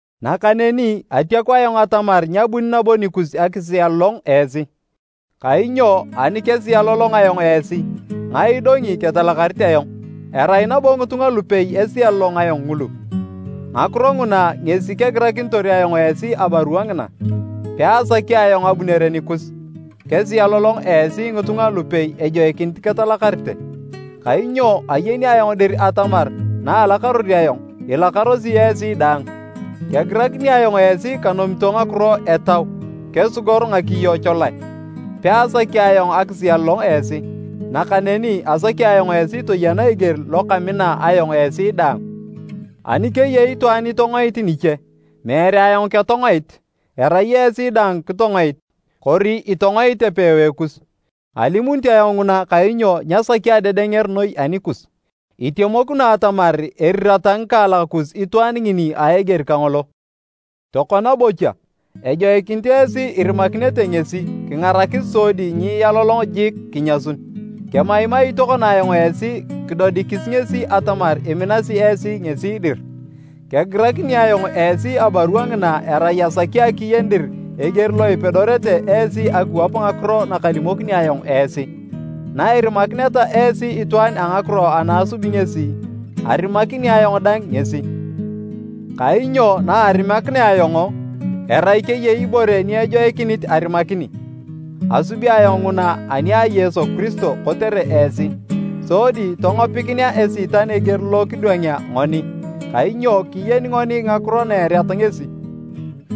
Nakaneni atiaku ayong atamar nyabuni nabo nikus akisialolong esi. Kainyo ani kesialolong ayong esi, ngae idongi ketalakarit ayong? Erai nabo ngitunga lupei esialolong ayong ngulu. Ngakiro nguna ngesi kegirakinitor ayong esi abarua ngina, peasaki ayong abunere nikus kesialolong esi ngitunga lupei ejoikinit ketalakarete. Kainyo ayeni ayong dir atamar naalakaror ayong, ilakarosi esi daang. Kegirakini ayong esi kanomito ngakiro etau kesigor ngakiyo cholae, peasaki ayong akisialolong esi, nakaneni asaki ayong esi toyena eger lo kamina ayong esi daang. Ani keyei itwaan itongoit niche, meere ayong ketongoit, erai esi daang kitongoit, kori itongoit epewae kus. (Alimunit ayong nguna kainyo nyasaki adedenger noi anikus.) Itemokino atamar erirata ngikaalak kus itwaan ngini a eger kangolo. Tokona bocha, ejoikinit esi irimakinete ngesi kingarakis sodi nyialolongio jik kinyasun. Kemaimai tokona ayong esi kidodikis ngesi atamar iminasi esi ngesi dir. Kegirakini ayong esi abarua ngina erai asaki akiyen dir eger lo ipedorete esi akiwap ngakiro nakalimokini ayong esi. Nairimakineta esi itwaan a ngakiro ana asub ngesi, arimakini ayong dang ngesi. Kainyo naarimakinea ayong, erai keyei ibore ni ejoikinit arimakini, asubi ayong nguna ani a Yesu Kiristo, kotere esi, sodi tongopikinea Esiitan eger lo kidwangea ngoni, kainyo kiyeni ngoni ngakiro na ereat ngesi.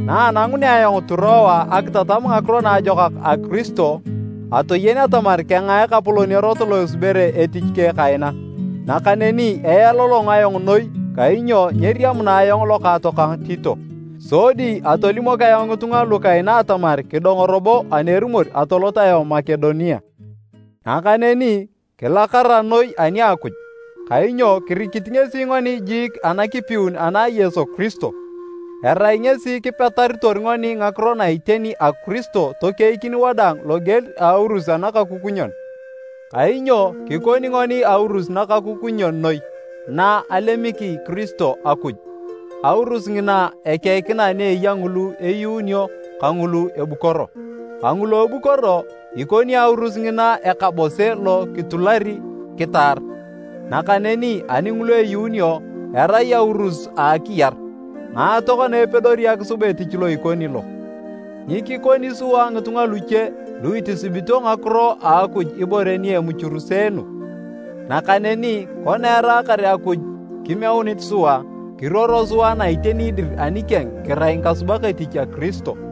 Naanangunea ayong Turoa akitatam Ngakiro Naajokak a Kiristo, atoyen atamar kengaa Ekapolon erot lo esubere etich keng kaina. Nakaneni ealolong ayong noi kainyo nyeriamuna ayong lokaatokang Tito. Sodi atolimok ayong ngitunga lu kaina atamar kidongo robo ani erumor atolot ayong Makedonia. Nakaneni kilakara noi ani a Akuj! Kainyo kirikit ngesi ngoni jiik anakipiun ana a Yesu Kiristo. Erai ngesi kipetaritor ngoni ngakiro na iteni a Kiristo tokeikin wadaang loger a aurus anakakukunyon. Kainyo kikoni ngoni aurus nakakukunyon noi na alemiki Kiristo Akuj, aurus ngina ekeikina ni eya ngulu eyuununio kangulu ebukoro. Kangulu ebukoro, ikoni aurus ngina ekabose lo kitulari kitaar, nakaneni ani ngulu eyuunio, erai aurus a akiyar. Ngae tokona epedori akisub etich lo ikoni lo? Nyikikoni sua ngitunga luche lu itisibito ngakiro a Akuj ibore ni emuchuruseenu. Nakaneni kona eraakar Akuj kimeunit sua, kiruoro sua na iteni dir anikeng kirai ngikasubak etich a Kiristo.